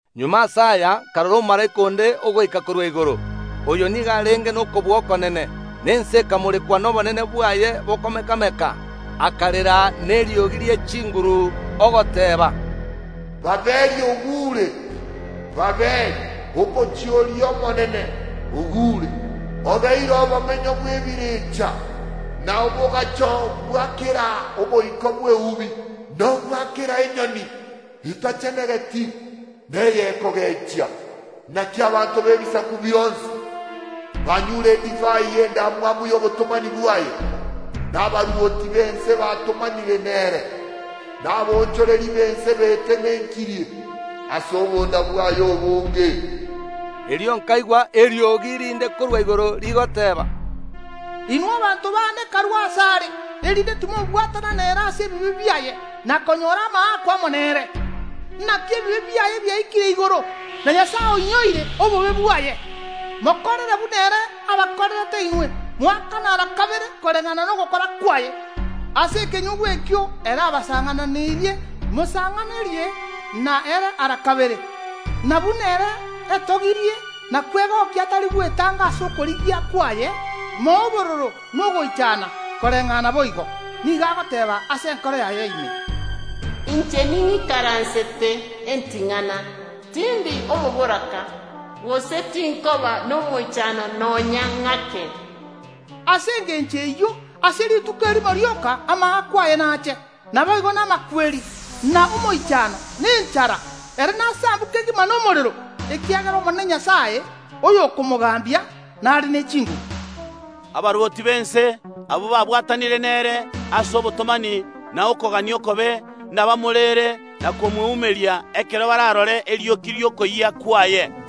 Magega ase aya nkarora omomalaika onde ogoika korwa igoro. Oyo nigo arenge nokobua okonene, na ense ekamorekwa nobonene bwaye bokomeka‐meka. Akarera neriogi rie chinguru, ogoteeba, “Babiloni ogure! Babiloni, omochie oria omonene, ogure! Obeire obomenyo bw’ebirecha, na oboagacho bwa kera omoika bw’eubi, na obwa kera enyoni etachenegeti na ey’okogechia. Naki abanto b’ebisaku bionsi banyure edivai y’endamwamu y’obotomani bwaye, na abarwoti b’ense batomanire nere, na abaonchoreria b’ense betenenkirie ase obonda bwaye obonge.” Erio nkaigwa eriogi rinde korwa igoro, rigoteeba, “Inwe abanto baane, karue asare, erinde timobwatana nere ase ebibe biaye, na konyora amaakwa amo nere. Naki ebibe biaye biaikire igoro, na Nyasae oinyoire obobe bwaye. Mokorere buna ere abakorerete inwe, moakane ara kabere koreng’ana nogokora kwaye. Ase ekenyugwa ekio ere abasang’ananeirie, mosang’anerie na ere ara kabere. Na buna ere etogirie na kwegokia atari gwetanga ase okorigia kwaye, moe obororo na ogoichana koreng’ana boigo. Nigo agoteeba ase enkoro yaye ime: Inche ning’ikaransete eting’ana, tindi omoboraka, gose tinkoba nomoichano nonya ng’ake! Ase engencho eyio, ase rituko erimo rioka amaakwa aye nache, naboigo namakweri, na omoichano, na enchara. Ere nasambwe kegima nomorero, ekiagera Omonene Nyasae Omobui, oyokomogambia, nare ne chinguru.” Abarwoti b’ense, abwo babwatanire nere ase obotomani na okogania okobe nabamoreere na komweumeria ekero bararore erioki ri’okoyia kwaye.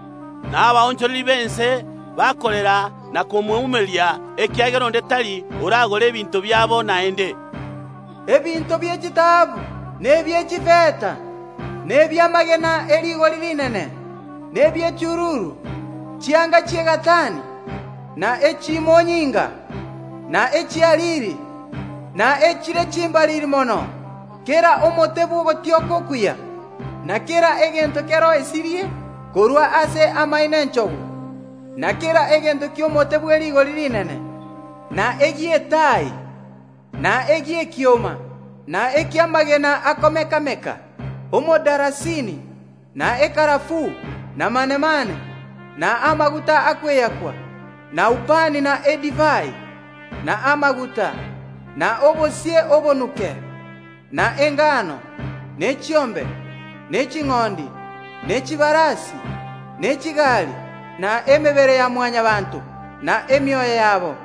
Na abaonchoreria b’ense bakorera na komweumeria, ekiagera onde tari oragore ebinto biabo naende: Ebinto bie chitaabu, na ebie chifeta na ebi’amagena e rigori rinene, na ebie chiruru; chianga chi’egatani, na echimonyinga, na echi’ariri, na echire chimbariri mono; kera omote bw’ogotioka okuya, na kera egento keroisirie korwa ase amaino ’enchogu, na kera egento ki’omote bw’erigori rinene, na egi’etai, na egi’ekioma, na eki’amagena akomeka‐meka; omodalasini, na ekarafuu, na manemane, na amaguta akweakwa, na ubani na edivai, na amaguta, na obosie obonuke, na engano, ne chiombe, ne ching’ondi, ne chibarasi, ne chigari, na emebere ya Mwanyabaanto na emioyo yabo.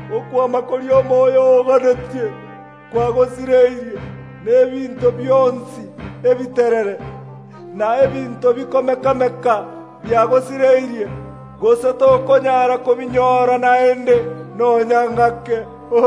“Okwama koria omoyo oo oganetie kwagosireirie, na ebinto bionsi ebiterere. Na ebinto bikomeka‐meka biagosireirie, gose tokonyara kobinyora naende nonya ng’ake!”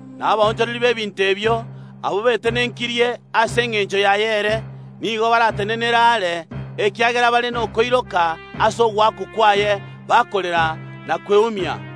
Na abaonchoreria b’ebinto ebio, abwo betenenkirie ase engencho yaye ere, nigo baratenenere aare, ekiagera bare nokoiroka ase ogoakwa kwaye, bakorera na kweumia,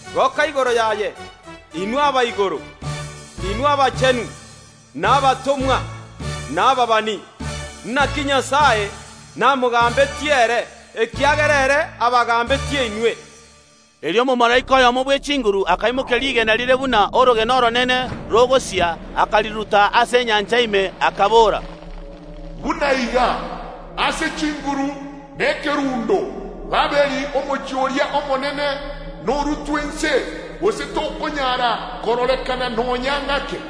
Goka igoro yaye, inwe aba igoro, inwe abachenu, na abatomwa, na ababani, naki Nyasae namogambetie ere, ekiagera ere abagambetie inwe!” Erio omomalaika oyomo bw’echinguru akaimokia rigena rire buna orogena oronene rogosia, akariruta ase enyancha ime, akabora, “Buna iga, ase chinguru na ekerundo, Babiloni, omochie oria omonene, norutwe inse, gose tokonyara kororekana nonya ng’ake.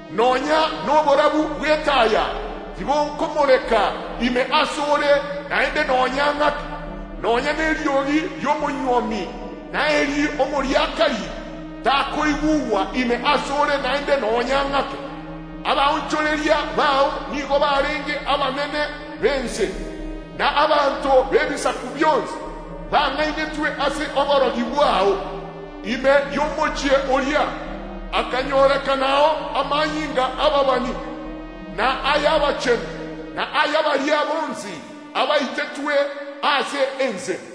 nonya noborabu bw’etaya tibokomoreka ime ase ore naende nonya ng’ake; nonya neriogi ri’omonywomi na eri ’omoriakari takoigugwa ime ase ore naende nonya ng’ake. Abaonchoreria bao nigo barenge abanene b’ense, na abanto b’ebisaku bionsi bang’ainetwe ase oborogi bwao. Ime y’omochie oria akanyorekanao amanyinga y’ababani, na ay’abachenu, na aya baria bonsi abaitetwe ase ense.”